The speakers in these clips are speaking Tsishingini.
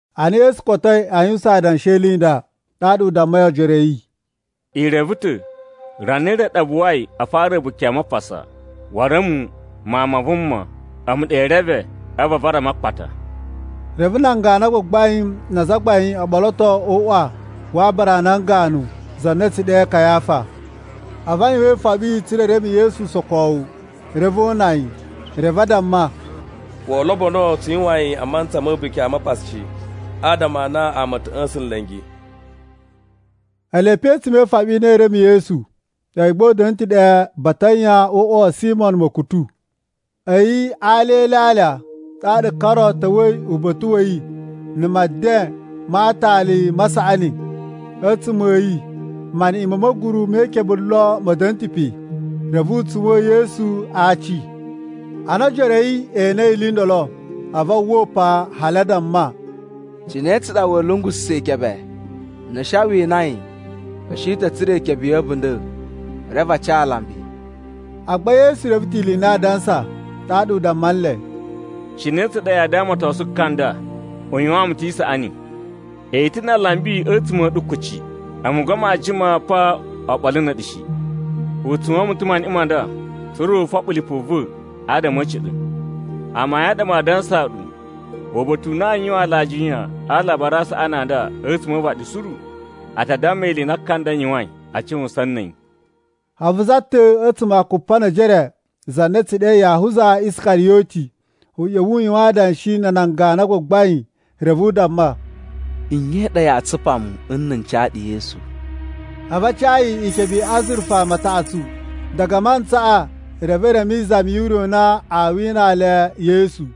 Ana Yesu kotoi a yuwusan adanshi e ili i nda, ɗaɗa u dammai ojoro a̱ yi, “I reve ta̱, rana re ɗa buwai a fara A̱buki a Mapasa, waru a̱mu, Mawun ma Vuma, a̱mu ɗa ee reme, a̱vu a vara mu a akpata.” Reve nan ganu a gbagbain na azagbain o ɓoloto o uꞌwa wa aabara a nan ganu na a̱ tsu ɗe Kayafa. A̱vu a yuwan ifoɓi tsa̱ra̱ e reme Yesu usokowu, reve o una yi. Reve a damma, “Woo lobono tsu yuwan yi a mantsa ma̱ A̱buki a Mapasa shi, adama a na ama a̱ ta̱ ꞌya̱sa̱n nla̱ngi.” Ele pe a̱tsuma̱ e ifoɓi i na ee reme Yesu, a̱yi gba u da̱na̱ ta̱ ɗe Batanya o uꞌwa wa̱ Simo ma̱kutu. A̱yi a alya e ilyalya ɗaɗa ka ro ta̱wa̱i uba̱ta̱ wa̱ yi na̱ meden ma aatali ma saꞌani. A̱tsuma̱ a̱ yi maniꞌin ma̱ ma̱guru me ikebe lon ma̱ da̱na̱ ta̱ pe. Reve u tsuwa̱n Yesu a aaci. Ana o ojoro a̱ yi e enei ili i ndolo, a̱vu a uwwa upan hali a damma, “Cine tsa ɗa wa̱a̱ lungususa̱ ikebe? Na̱ a̱ shi a wina yi, a̱ shi ta̱ tsura̱ ikebe ya̱ a̱bunda̱, reve a ca alambi.” Agba Yesu reve ta̱ ili i na aa dansa, ɗaɗa u damma nle, “Cine tsa ɗa yaa damatosun ka nda? U yuwaan mu ta̱ isaꞌani. I ta̱ na alambi a̱tsuma̱ a̱ ɗu kuci, a̱mu agba maa jima pa oɓolo na̱ a̱ɗu shi. U tsuwa̱n mu ta̱ maniꞌin ma nda, tsa̱ra̱ u foɓo lipu va̱ adama a̱ a̱ciɗa̱. Amayun a ɗa maa dansaa ɗu, uba̱ta̱ u na aa yuwan alajiya a Alabari a Saꞌani a nda a̱tsuma̱ o uvaɗi suru, a ta damma ili i na ka nda yuwain a cuwusan na̱ a̱yi.” A̱vu za ta̱ a̱tsuma̱ a Kupanejere, za na a̱ tsu ɗe Yahuza Iskariyoti, ꞌya̱wa̱ u yuwan adanshi na̱ nan ganu a gbagbain. Reve u damma, “Nye i ɗa yaa tsupa mu nna̱ n ca ɗu Yesu?” A̱vu a ca yi ikebe i azurufa mataꞌatsu. Diga a mantsaꞌa reve u reme izami ure u na waa winaa le Yesu.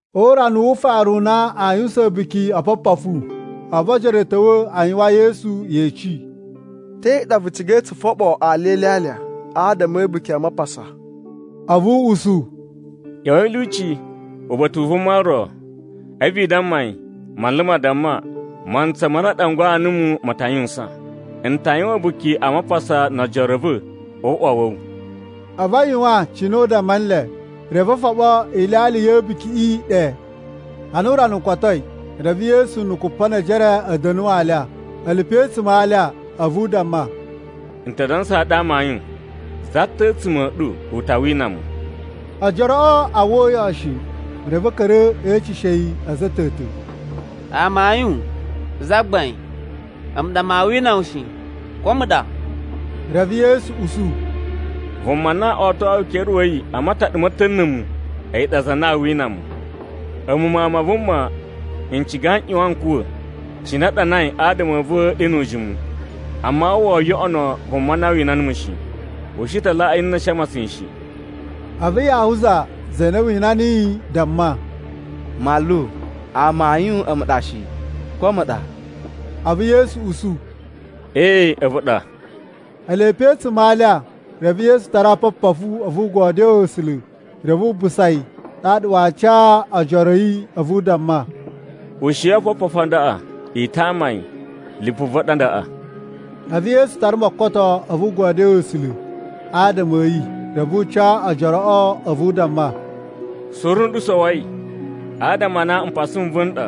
O urana wu ufaru u na aa yuwusan A̱buki o Opopofu, a̱vu ojoro a̱ ta̱wa̱ a yuwan Yesu yeci, “Te ɗa vu cigai tsu foɓo alya e ilyalya adama A̱buki a Mapasa?” A̱vu u usu, “ꞌYa̱wa̱i a̱ lyuci uba̱ta̱ u vuma ro, a̱vu i damma yi, Manlu ma damma: ‘Mantsa ma na a ɗangwaa numu ma ta yuwusan. N ta yuwan A̱buki a Mapasa no ojoro a̱ va̱ o uꞌwa wa̱ wu.’” A̱vu a yuwan cine u damma nle, reve o foɓo ilyalya ya̱ A̱bukiꞌi ɗe. Ana urana u kotoi, reve Yesu na̱ Kupanejere a̱ da̱nu alya. Ele pe a̱tsuma̱ a alya, a̱vu u damma, “N ta dansaa ɗu amayun, za ta̱ a̱tsuma̱ a̱ ɗu u ta wina mu.” Ojoroꞌo a uwwa uyoꞌo shi, reve a̱ ka̱ra̱ e eceshe yi a̱za̱ a̱ ta̱ ta̱, “Amayun, Zagbain, a̱mu ɗa maa wina wu shi. Ko a̱mu ɗa?” Reve Yesu usu, “Vuma na otoyi ukere wa̱ yi a mataɗa ma̱ ta̱ na̱ a̱mu, a̱yi ɗa za na aa wina mu. A̱mu Mawun ma Vuma, n ciga n ꞌyuwan n kuwa̱, cine a ɗanai adama a̱ va̱ ɗe nu ujimu. Amma woo yoꞌono vuma na wina numu shi. U shi ta laꞌaa yi nna̱ a̱ shi a matsan yi shi.” A̱vu Yahuza za na aa wina yi, damma, “Manlu, amayun a̱mu ɗa shi, ko a̱mu ɗa?” A̱vu Yesu usu, “Ee, a̱vu ɗa.” Ele pe a̱tsuma̱ a alya, reve Yesu tara oopopofu. A̱vu u godyoo A̱sula̱ reve wu busa yi. Ɗaɗa waa ca ojoroꞌo a̱vu u damma, “Ushiyi oopopofu a ndaꞌa i tama yi, lipu va̱ ɗa ndaꞌa.” A̱vu Yesu tara mokoto a̱vu u godyoo A̱sula̱ adama a̱ yi, reve u ca ojoroꞌo a̱vu u damma, “Suru nɗu sowoi. Adama a na mpasa n va̱ n ɗa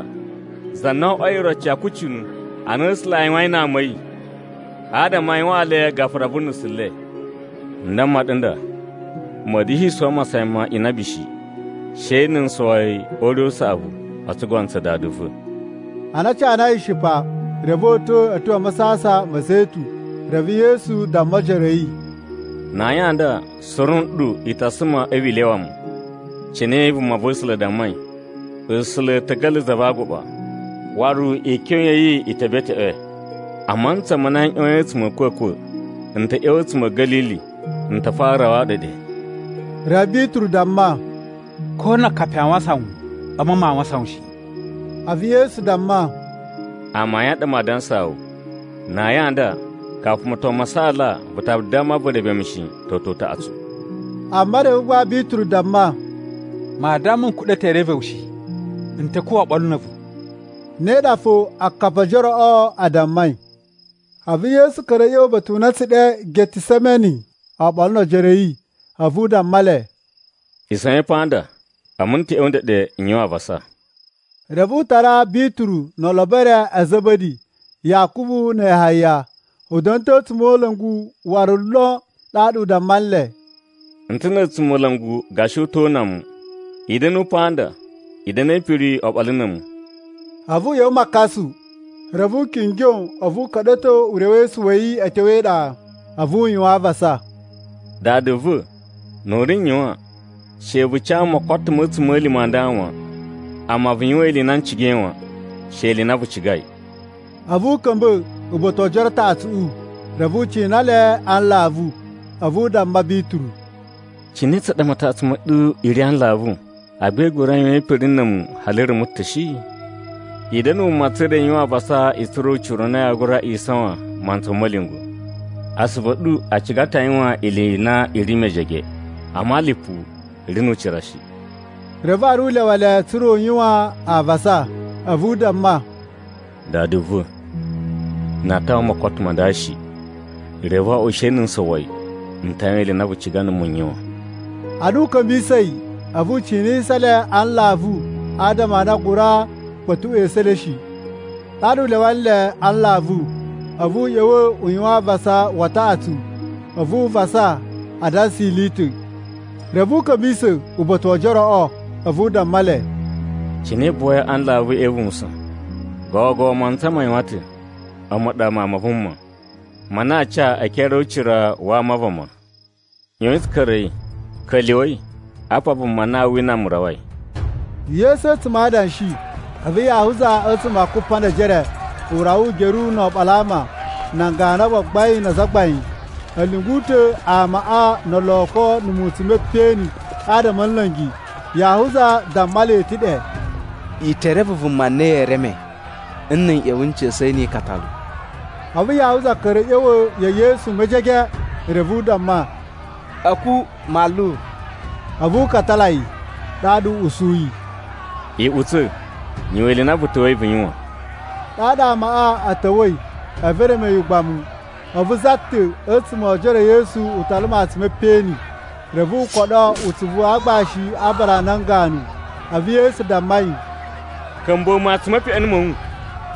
za na o oꞌwoi iroci ya akucunu a na A̱sula̱ a yuwain na ama a̱ yi, adama a yuwaan le gafura vu nusu le. N damma ɗu nda, ma̱a̱ da̱shi sowo masayan ma inabi shi, she na̱ n sowo yi o ure u saꞌavu o tsugono tsa Dada va̱.” Ana a canai ishipa, reve o uta̱ a̱ tyo a Masasan ma̱ Zetun. Reve Yesu damma ojoro a̱ yi, “Na ayin a nda, suru nɗu i ta suma a̱vu i lyawa mu, cine vumava̱sula̱ dammai, ‘A̱sula̱ a̱ ta̱ ga̱la̱ za va aguɓa, waru ikyon ya̱ yi i te beteꞌwe.’ “A mantsa ma na n ꞌyoyin a̱tsuma̱ a̱ a̱kwa̱kwa̱, n ta ꞌya̱wa̱ a̱tsuma̱ a̱ Ga̱lili, n ta fara rawaa ɗu ɗe.” Reve Bituru damma, “Ko na akapi aa wasan wu, a̱mu maa wasan wu shi!” A̱vu Yesu damma, “Amayun a ɗa maa dansaa wu, na ayin a nda, kafu moton ma saala vu ta damma vu reve mu shi, toto utaꞌatsu.” Amma reve gba Bituru damma, “Maa damma n kuɗa̱ ta̱ e reve wu shi! N ta̱ kuwa̱ oɓolo na̱ a̱vu!” Ne ɗa fo akapi o ojoroꞌo a dammai. A̱vu Yesu ka̱ra̱ a̱ ꞌya̱wa̱ uba̱ta̱ u na a̱ tsu ɗe Getisemeni oɓolo no ojoro a̱ yi, a̱vu u damma le, “Isawain pa nda, a̱mu n ta̱ ꞌya̱wa̱ ndeɗe n yuwan avasa.” Reve u tara Bituru no olobo e re a̱ Za̱ba̱di, Yakubu na̱ Yahaya. U da̱na̱ ta̱ na̱ a̱tsumola̱ngu waru lon. Ɗaɗa u damma nle, “N ta̱ na̱ a̱tsumola̱ngu gashi u to una mu. I da̱nu pa nda, i da̱na̱ e ipiri oɓolo na̱ a̱mu.” A̱vu u ꞌya̱wa̱ makasu, reve u kingyo a̱vu u ka̱ɗa̱to urewesu wa̱ yi a̱ tyo e iɗa. A̱vu u yuwan avasa, “Dada va̱, nu u n ri yuwan, she vu ca mu mokoto ma̱ a̱tsuma̱lima̱ a nda wan. Amma vu yuwan ili i na n cigai wan, she ili i na vu cigai.” A̱vu u ka̱mba̱ uba̱ta̱ wo ojoro a taꞌatsuꞌu, reve u cina le a nlavu. A̱vu u damma Bituru, “Cine tsa ɗa mataꞌatsu ma̱ ɗu i ri a nlavu, agba i gura yuwan ipiri na̱ a̱mu hali rumu ta̱ shi? I da̱na̱ wuma tsa̱ra̱ i yuwan avasa i tsura̱ ucira u na yaa gura isawan mantsa ma̱ ma̱lyungwa̱. Asuvu a̱ ɗu a ciga ta̱ a yuwan ili i na i ri mejege, amma lipu ri nu ucira shi.” Reve waru u lyawa le tsa̱ra̱ u yuwan avasa, a̱vu u damma, “Dada va̱! Na aa tawa mokoto ma nda shi, reve wo oꞌwo she na̱ n sowo yi, n ta yuwan ili i na vu ciga numu n yuwan.” Ana u ka̱mbisa̱i a̱vu u cinisa le a nlavu adama a na a gura kpa̱tuꞌwa̱ esu e le shi. Ɗaɗa u lyawa nle a nlavu, a̱vu u ꞌya̱wa̱ u yuwan avasa wa taꞌatsu, a̱vu u vasa adansa ili i ta̱. Reve u ka̱mbisa̱ uba̱ta̱ wo ojoroꞌo, a̱vu u damma le, “Cine i buwai a nlavu e ivuwusan? Gogo mantsa ma yuwan ta̱. A̱mu ɗa, Mawun ma Vuma, ma na aa ca e ekere o ucira wa ama a vama. ꞌYoyin tsu ka̱ra̱i. Ka̱lyuwa̱i, apa vuma na aa wina mu rawai.” Yesu a̱tsuma̱ a adanshi, a̱vu Yahuza a̱tsuma̱ a Kupanejere, u rawa ugeru no oɓolo a ama. Nan ganu a gbagbain na azagbain a̱ lyungu ta̱ amaꞌa no oloko na̱ mutsun m peꞌeni adama a̱ nla̱ngi. Yahuza damma le ta̱ ɗe, “I te reve vuma na yee reme, na̱ n ꞌya̱wa̱ n ca̱sa̱ yi ni ikatalu.” A̱vu Yahuza ka̱ra̱ a̱ ꞌya̱wa̱ ya̱ Yesu mejege, reve u damma, “A̱ku, Manlu!” a̱vu u katala yi. Ɗaɗa u usuyi, “Iꞌutsa̱, yuwan ili i na vu ta̱wa̱i vu yuwan.” Ɗaɗa amaꞌa a̱ ta̱wa̱i a̱vu e reme yi ugbamu. A̱vu za ta̱ a̱tsuma̱ o ojoro e Yesu u tala matsun me peꞌeni, reve u koɗo utsuvu wa aagbashi wa aabara a nan ganu. A̱vu Yesu damma yi, “Ka̱mbuwa̱ matsun me peꞌeni ma̱ wu.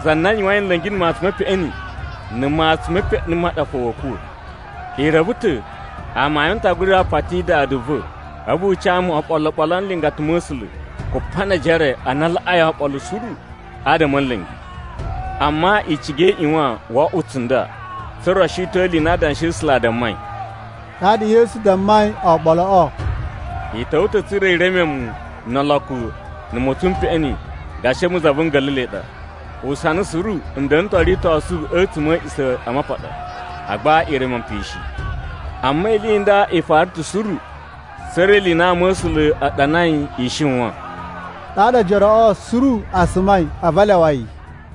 Za na yuwain nla̱ngi na̱ matsun me peꞌeni, na̱ matsun me peꞌeni ma ɗa fo wa̱a̱ kuwa̱. I reve ta̱ amayun n ta gura pati Dada va̱, a̱vu u ca mu oɓolo oɓolo a nlingata ma̱ A̱sula̱ kupa ne ejere a na a laꞌai oɓolo suru adama a̱ nla̱ngi. Amma i ciga i ꞌyuwan wo oꞌwo tsunda, tsa̱ra̱ o shiton ili i na Adanshi a̱ A̱sula̱ a dammai.” Ɗaɗa Yesu dammai oɓoloꞌo, “I ta̱wa̱ ta̱ tsa̱ra̱ i reme mu no oloko na̱ mutsun m peꞌeni gashi a̱mu za vu nga̱la̱la̱i ɗa. Usana suru n da̱na̱ ta̱ o ritosu a̱tsuma̱ a̱ A̱a̱ꞌisamapaɗa, agba i reme mu pe shi. Amma ili i nda i fara ta̱ suru, tsa̱ra̱ ili i na ama̱sula̱ a ɗanai i shiwan.” Ɗaɗa ojoroꞌo suru a sumai a̱vu a lyawa yi.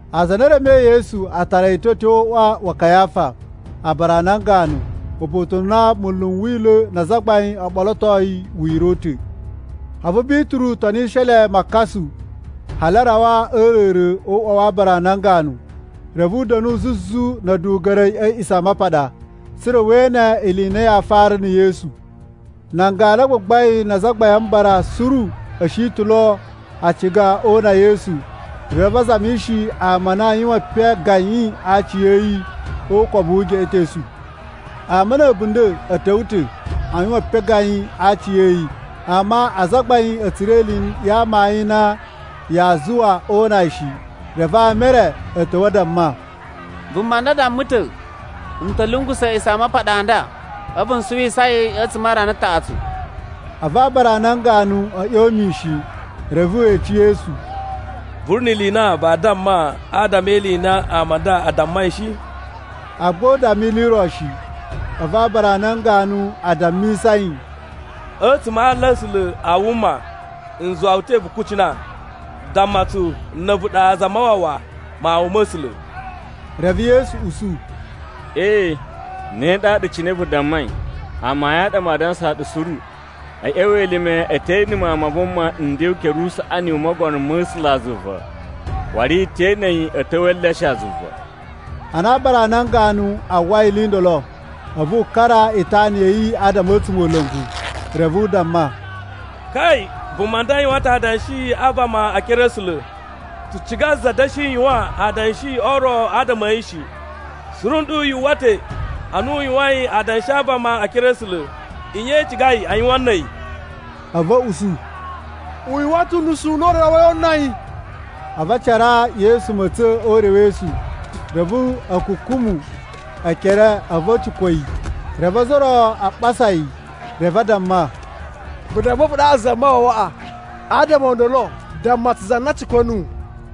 Aza a na e remei Yesu a tara yi ta̱ a̱ tyo o uꞌwa wa Kayafa, aabara a nan ganu, uba̱ta̱ u na munlu n Wila̱ na azagbain o ɓolotoi wira̱ u ta̱. A̱vu Bituru tonishi le makasu, hali a rawa a̱ a̱a̱ra̱ra̱ o uꞌwa wa aabara a nan ganu. Reve u da̱nu zuzu na̱ a̱duga̱ri a̱ A̱a̱ꞌisamapaɗa, tsa̱ra̱ we ene ili i na yaa fara na̱ Yesu. Nan ganu a gbagbain na Azagbain a Mbara suru a̱ shi ta̱ a ciga o una Yesu. Reve a zamishi ama a na aa yuwan epen gayin a aci a̱ yi o ukobu wu ugeꞌetosu. Ama na̱ a̱bunda̱ a̱ ta̱wa̱ ta̱ a yuwan epen gayin a aci a̱ yi, amma azagbain a̱ tsura̱ ili ya amayun i na yaa zuwa o una yi shi. Reve ama e re a̱ ta̱wa̱ a damma, “Vuma nda damma ta̱, ‘N ta̱ lungusa̱ A̱a̱ꞌisamapaɗa a nda, a̱vu n suwisa yi a̱tsuma̱ a rana taꞌatsu.’” A̱vu aabara a nan ganu a̱ ꞌyon mishin, reve we ece Yesu, “Vu ri ni ili i na vaa damma adama e ili i na ama a nda a dammai shi?” Agba u damma ili i ro shi. A̱vu aabara a nan ganu a dammisa yi, “A̱tsuma̱ a aala a̱ A̱sula̱ a wuma n zuwa wu ta̱ vu kucina: Damma tsu na̱ a̱vu ɗa Zamawawa, Mawun ma̱ A̱sula̱.” Reve Yesu usu, “Ee, ne ɗaɗa cine vu dammai. Amayun a ɗa maa dansaa ɗu suru: a̱ ꞌya̱wa̱ elime i te ene Mawun ma Vuma nden o ukere usaꞌani u Mogono ma̱ A̱sulazuva, waru i te ene yi a̱ ta̱wa̱ e eleshe a zuva!” Ana aabara a nan ganu a uwwai ili i ndolo, a̱vu wu kara itana ya̱ yi adama a̱ a̱tsumola̱ngu, reve u damma, “Kai! Vuma nda yuwan ta̱ adanshi a vama e ekere a̱ A̱sula̱! Tsu ciga za da̱shi yuwan adanshi o ro adama a̱ yi shi. Suru nɗu yu uwwa ta̱ a na u yuwain adanshi a vama e ekere a̱ A̱sula̱. Nye i cigai a yuwan na̱ a̱yi?” A̱vu a̱ usu, “U yuwan ta̱ unusu u na u rawai o una yi.” A̱vu a caraa Yesu ma̱tsa̱n o urewesu, reve a̱ kukumu ekere a̱vu a̱ cikwa̱ yi. Reve ozo o ro a ɓasa yi. Reve a damma, “Vu damma a̱vu ɗaɗa Zamawawaꞌa! Adama o ndolo damma tsu za na cikwa̱ nuwu!”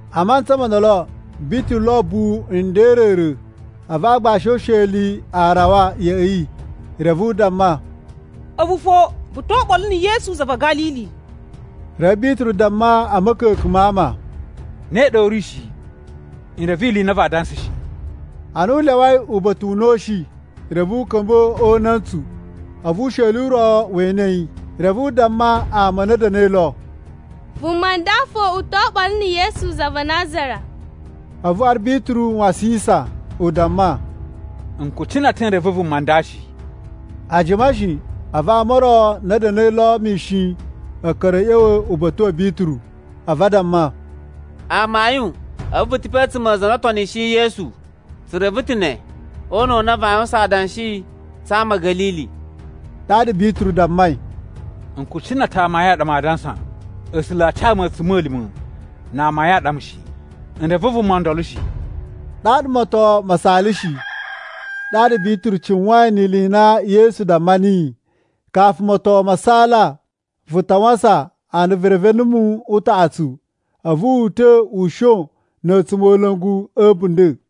A mantsa mo ndolo, Bituru lo ubuwu nden a̱ a̱a̱ra̱ra̱, a̱vu aagbashi o usheli a rawa ya̱ꞌa̱ yi, reve u damma, “A̱vu fo vu to oɓolo na̱ Yesu za va̱ Ga̱lili.” Reve Bituru damma a̱ ma̱ka̱ka̱n ma ama, “Ne ɗa u ri shi! N reve ili i na vaa dansa shi!” Ana u lyawai uba̱ta̱ u na u shi, reve u ka̱mba̱ o una̱ntsu, a̱vu usheli u ro we ene yi. Reve u damma ama a na a̱ da̱na̱i lo, “Vuma nda fo u to oɓolo na̱ Yesu za va Nazara.” A̱vu waru Bituru wasisan u damma, “N kucina ta̱ n reve vuma nda shi!” A jima shi, a̱vu ama o ro a na a̱ da̱na̱i lo mishin a̱ ka̱ra̱ a̱ ꞌya̱wa̱ uba̱ta̱ wa̱ Bituru a̱vu a damma, “Amayun, a̱vu vu ta̱ pe a̱tsuma̱ a aza a na o tonishiyi Yesu. Tsu reve ta̱ ne, o una̱ u na vaa yuwusan adanshi tsa ama a̱ Ga̱lili.” Ɗaɗa Bituru dammai, “N kucina ta̱ amayun a ɗa maa dansa! A̱sula̱ a ca mu a̱tsuma̱lima̱ na amayun a ɗa mu shi! N reve vuma ndolo shi!” Ɗaɗa moton ma saalashi. Ɗaɗa Bituru cuwain ni ili i na Yesu damma niyi: “Kafu moton ma saala, vu ta wasan a na vu reve numu utaꞌatsu!” A̱vu wu uta̱ u shon na̱ a̱tsumola̱ngu a̱ a̱bunda̱.